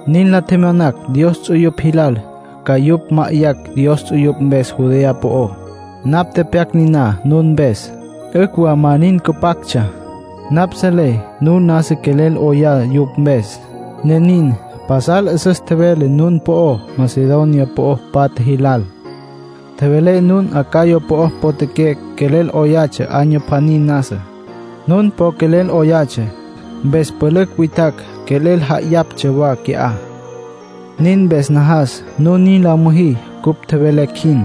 Nin la tjemyonacj Dios ts'uyupj jilal ca yupj ma'ayacj Dios ts'uyupj mpes Judea po'ó. Napj tepyac niná nun mpes. 'Ücj wa ma nin cüpactsja; napj selé nun nasa quelel 'oyá yupj mpes, ne nin. Pasal 'üsüs tjevelé nun po'ó Macedonia po'o patja jilal. Tjevelé nun Acaya po'o potjaqué quelel 'oyatsja año pjaní nasa. Nun po quelel 'oyatsja, mpes pülücj witjacj quelel ja'ayaptsja wa qui'á. Nin mpes najas nun nin la müjí cupj tjevelecj jin,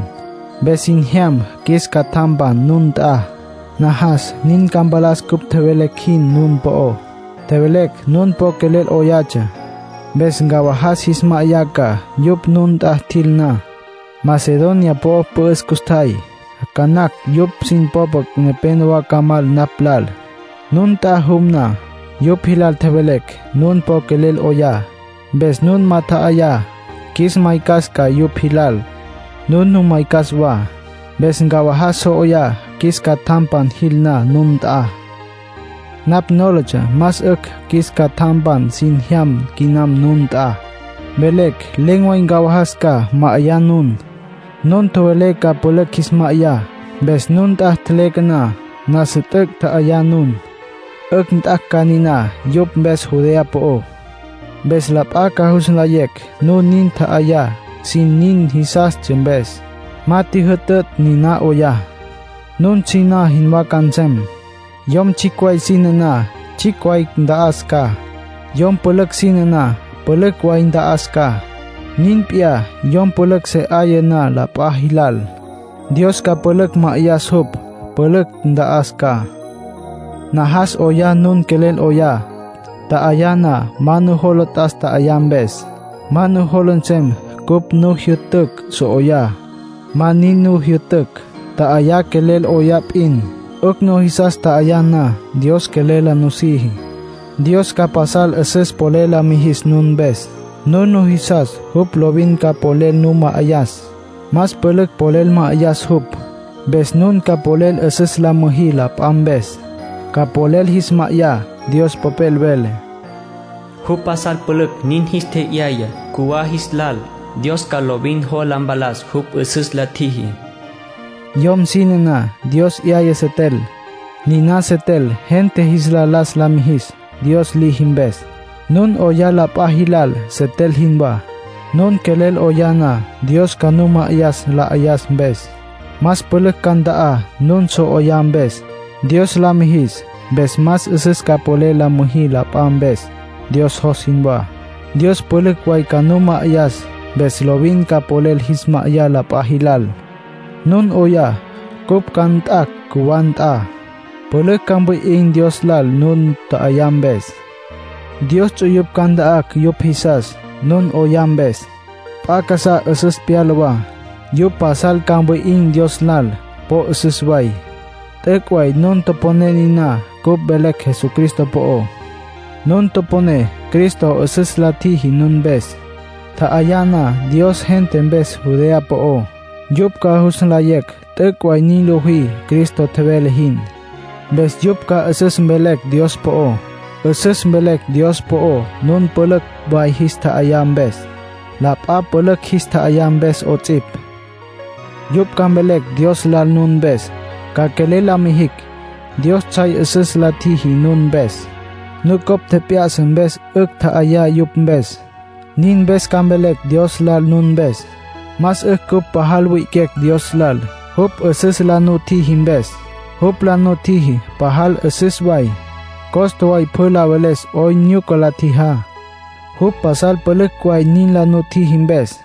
mpes sin jyam qjuis catjampan nun nt'a. Najas nin ca mpalas cupj tjevelecj jin nun po'ó. Tjevelecj nun po quelel 'oyatsja. Mpes ncawajas jis ma'ayá ca, yupj nun nt'a tjil na. Macedonia po'o pü'üs custjay. Ca nacj yupj sin popa nepénowa ca mal napj lal, nun nt'a jum na. Yupj jilal tjevelecj nun po quelel 'oyá, mpes nun ma tja'ayá, qjuis maycas ca yupj jis lal. Nun nu maycas wa. Mpes ncawajas so 'oyá, qjuis catjampan jil na nun nt'a. Napj nólatsja más 'ücj qjuis catjampan sin jyam quinam nun nt'a, mvelecj len̈ way ncawajas ca, ma'ayá nun. Nun tjowelé ca pülücj jis ma'ayá. Mpes nun nt'a tjeleque na, nasa t'üc' tja'ayá nun, 'ücj nt'acj ca niná yupj mpes Judea po'ó. Mpes la p'a ca jus nlayecj nun nin tja'ayá sin nin jisastsja mpes; ma tjijyü'tücj nin 'oyá. Nun siná jinwá ca nsem. Yom tsjicj way sine na, tsjicj way nta'as ca. Yom pülücj sine na, pülücj way nta'as ca. Nin p'iyá, yom pülücj se 'aya na la p'a jilal, Dios ca pülücj ma'ayas jupj, pülücj nta'as ca. Najas 'oyá nun quelel 'oyá. Tja'ayá na, ma nujola t'as tja'ayá mpes. Ma nujola nsem cupj nu jyü'tücj so 'oyá. Ma nin nu jyü'tücj. Tja'ayá quelel 'oyá p'in. 'Ücj nujisas tja'ayá na, Dios quelel la nusiji. Dios ca pasal 'üsüs polel la mijis nun mpes. Nun nujisas, jupj lovin ca polel nu ma'ayas. Más pülücj polel ma'ayas jupj. Mpes nun ca polel 'üsüs la müjí la p'a mpes. Ca polel jis ma'ayá. Dios Popel vele: “Jupj pasal pülücj nin jis tje'yaya cjuwá jis lal. Dios ca lovin jola mpalas jupj 'üsüs la tjiji”, Dios Popel nin vele. Yom sine na, Dios 'yaya setel. Niná setel gente jis la las la mijis, Dios liji mpes. Nun 'oyá la p'a jilal, setel jinwá. Nun quelel 'oyá na, Dios ca nu ma'ayas la 'ayas mpes. Más pülücj ca nta'á nun so 'oyá mpes, Dios la mijis. Mpes más 'üsüs ca polel la müjí la p'a mpes, Dios jos jinwá. Dios pülücj way ca nu ma'ayas, mpes lovin ca polel jis ma'ayá la p'a jilal. Nun 'oyá, cupj ca nt'acj cjuwá nt'a. Pülücj ca mwi'in̈ Dios lal nun tja'ayá mpes. Dios ts'uyupj ca nta'acj yupj jisas, nun 'oyá mpes. P'a casá 'üsüs pyala wa. Yupj pasal ca mwi'in̈ Dios lal; po 'üsüs way. T'üc' way nun toponé niná cupj velecj Jesucristo po'ó. Nun toponé Cristo 'üsüs la tjiji nun mpes. Tja'ayá na Dios gente mpes Judea po'ó, yupj ca jus nlayecj t'üc' way nin lojí Cristo tjevele jin. Mpes yupj ca 'üsüs mvelecj Dios po'ó. 'Üsüs mvelecj Dios po'ó nun pülücj way jis tja'ayá mpes, la p'a pülücj jis tja'ayá mpes 'ots'ipj. Yupj ca mvelecj Dios lal nun mpes, ca quelel la numijicj. Dios tsjay 'üsüs la tjiji nun mpes, nucopj tjep'ya'sa mpes 'ücj tja'ayá yupj mpes; nin mpes ca mvelecj Dios lal nun mpes. Más 'ücj cupj pajal wi'iquecj Dios lal, jupj 'üsüs la nutjiji mpes. Jupj la nutjiji pasal 'üsüs way, costa way pjü la veles 'oyn nyuca la tjijá, jupj pasal pülücj way nin la nutjiji mpes.